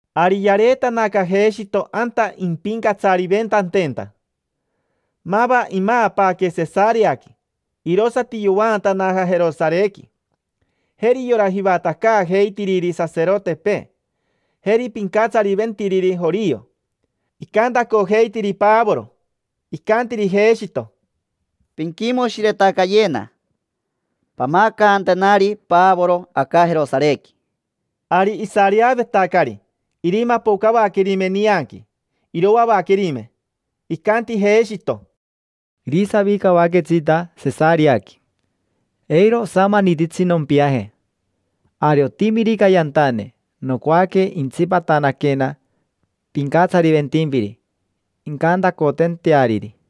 Ari yareetanaca Jeshito anta impincatsariventantenta. Mava imaapaaque Sesareaqui, irosati yovaantanaja Jerosarequi. Jeri yora jivatacaajeitiriri saserotepee, jeri pincatsariventiriri jorio, icantacojeitiri Pavoro. Icantiri Jeshito: —Pinquimoshiretacayena. Pamacantenari Pavoro aca Jerosarequi. Ari isareavetacari irimapocavaquerime nianqui, iroavaquerime. Icanti Jeshito: —Irisavicavaquetsita Sesareaqui. Eiro osamanititsi nompiaje. Ari otimirica yantane, nocoaque intsipatanaquena pincatsariventimpiri, incantacotanteariri.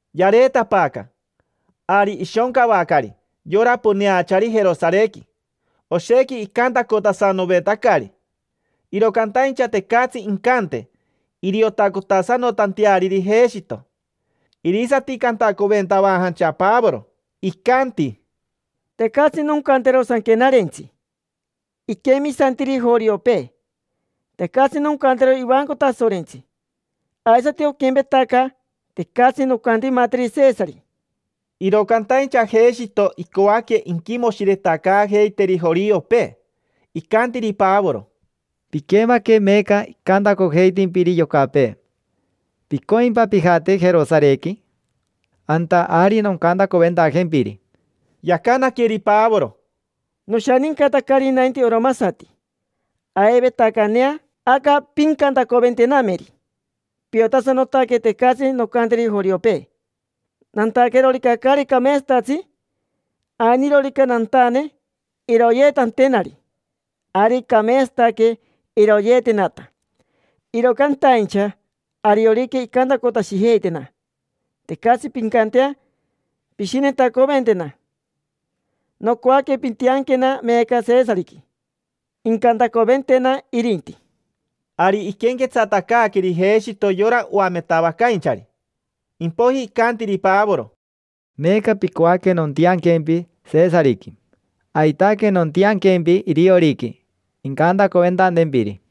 Yareetapaaca, ari ishoncavacari yora poneachari Jerosarequi. Oshequi icantacotasanovetacari, iro cantaincha tecatsi incante iriotacotasanotanteariri Jeshito. Irisati cantacoventavajancha Pavoro, icanti: —Tecatsi noncantero Sanquenarentsi iquemisantiri joriopee. Tecatsi noncantero ivanco Tasorentsi. Aisati oquempetaca, tecatsi noncantimateri Sesari. Iro cantaincha Jeshito icoaque inquimoshiretacaajeiteri joriopee. Icantiri Pavoro: —Piquemaque meeca icantacojeitimpiri yocapee. ¿Picoimpa pijate Jerosarequi? Anta ari noncantacoventajempiri. Yacanaqueri Pavoro: —Noshanincatacari nainti oromasati, aivetacanea aca pincantacoventenameri. Piotasanotaque tecatsi noncanteri joriopee. Nantaquerorica caari cameetsatatsi, ainirorica nantane iroyeetantenari, ari. Cameetsataque iroyeetenata. Iro cantaincha ariorica icantacotashijeitana, tecatsi pincantea pishinetacoventena. Nocoaque pintianquena meeca Sesariqui, incantacoventena irinti. Ari iquenquetsatacaaqueri Jeshito yora oametavacainchari. Impoiji icantiri Pavoro: —Meeca picoaque nontianquempi Sesariqui. Aitaque nontianquempi irioriqui, incantacoventantempiri.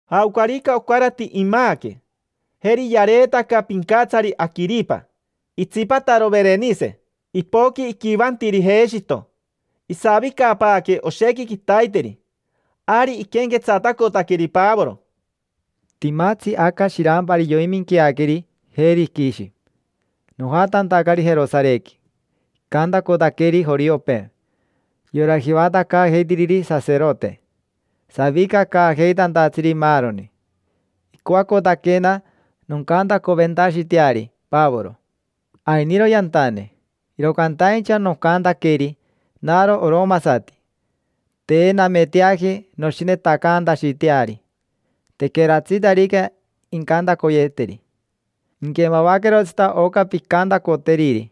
Jaocarica ocarati imaaque. Jeri yareetaca pincatsari Aquiripa, itsipataro Verenise. Ipoqui iquivantiri Jeshito. Isavicapaaque oshequi quitaiteri, ari iquenquetsatacotaqueri Pavoro: —Timatsi aca shirampari yoiminqueaqueri Virishi. Nojatantacari Jerosarequi, icantacotaqueri joriopee: yora jivatacaajeitiriri saserote, savicacaajeitantatsiri, maaroni. Icoacotaquena noncantacoventashiteari Pavoro: “Ainiro yantane”. Iro cantaincha nocantaqueri: “Naro oromasati. Te nameteaji noshinetacantashiteari tequeratsitarica incantacoyeeteri. Inquemavaquerotsita oca pincantacoteriri.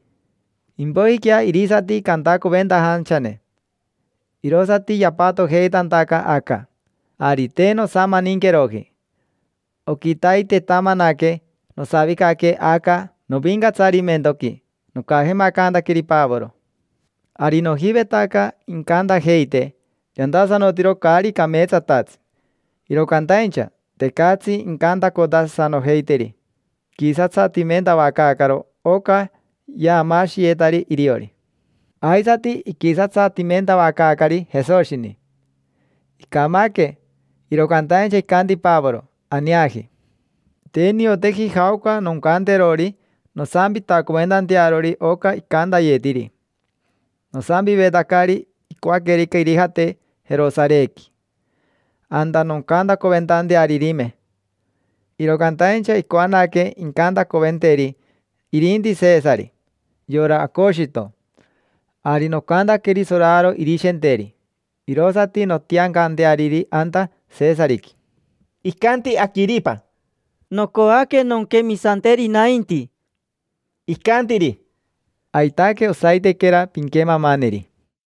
Impoijiquea irisati cantacoventajanchane”. Irosati yapatojeitantaca aca, ari te nosamaninqueroji. Oquitaitetamanaque nosavicaque aca novincatsarimentoqui, nocajemacantaqueri Pavoro. Ari nojivetaca incantajeite yantasanotiro caari cameetsatatsi. Iro cantaincha, tecatsi incantacotasanojeiteri. Iquisatsatimentavacaacaro oca yaamaashiyetari iriori. Aisati iquisatsatimentavacaacari Jesoshini. Icamaque, iro cantaincha icanti Pavoro: “Aneaji”. Te nioteji jaoca noncanterori nosampitacoventantearori oca icantayetiri. Nosampivetacari icoaquerica irijate Jerosarequi, anta noncantacoventantearirime. Iro cantaincha icoanaque incantacoventeri irinti Sesari, yora Aocoshito. Ari nocantaqueri soraro irishenteri, irosati nontiancanteariri anta Sesariqui. Icanti Aquiripa: —Nocoaque nonquemisanteri nainti. Icantiri: —Aitaque, osaitequera pinquemamaneri.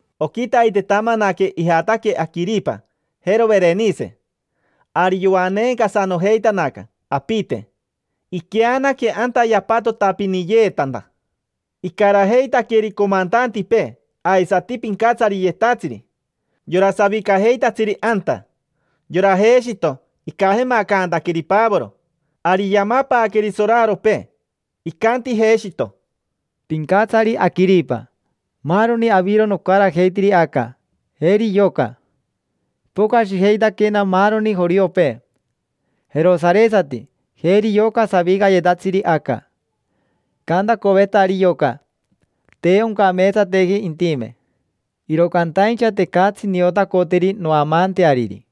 Oquitaitetamanaque ijataque Aquiripa, jero Verenishe. Ari yoaneencasanojeitanaca apite. Iqueanaque anta yapatotapiniyeetanta. Icarajeitaqueri comantantipee, aisati pincatsariyetatsiri: yora savicajeitatsiri anta. Yora Jeshito, icajemacantaqueri Pavoro. Ari yamapaaqueri soraropee. Icanti Jeshito: —Pincatsari Aquiripa. Maaroni aviro nocarajeitiri aca. Jeri yoca. Ipocashijeitaquena maaroni joriopee: jerosaresati, jeri yoca savicayetatsiri aca. Icantacovetari yoca: “Te oncameetsateji intime”. Iro cantaincha tecatsi niotacoteri noamaanteariri.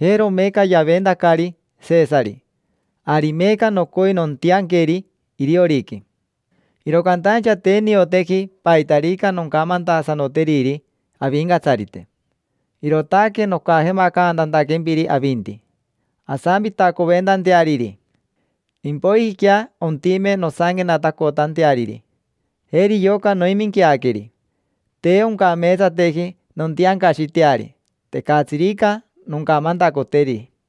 Jero meeca yaventacari Sesari, ari meeca nocoi nontianqueri irioriqui. Iro cantaincha te nioteji paitarica noncamantasanoteriri avincatsarite. Irootaque nocajemacantantaquempiri avinti, asampitacoventanteariri. Impoijiquea ontime nosanquenatacotanteariri. Jeri yoca noiminqueaqueri. Te oncameetsateji nontiancashiteari, tecatsirica noncamantacoteri.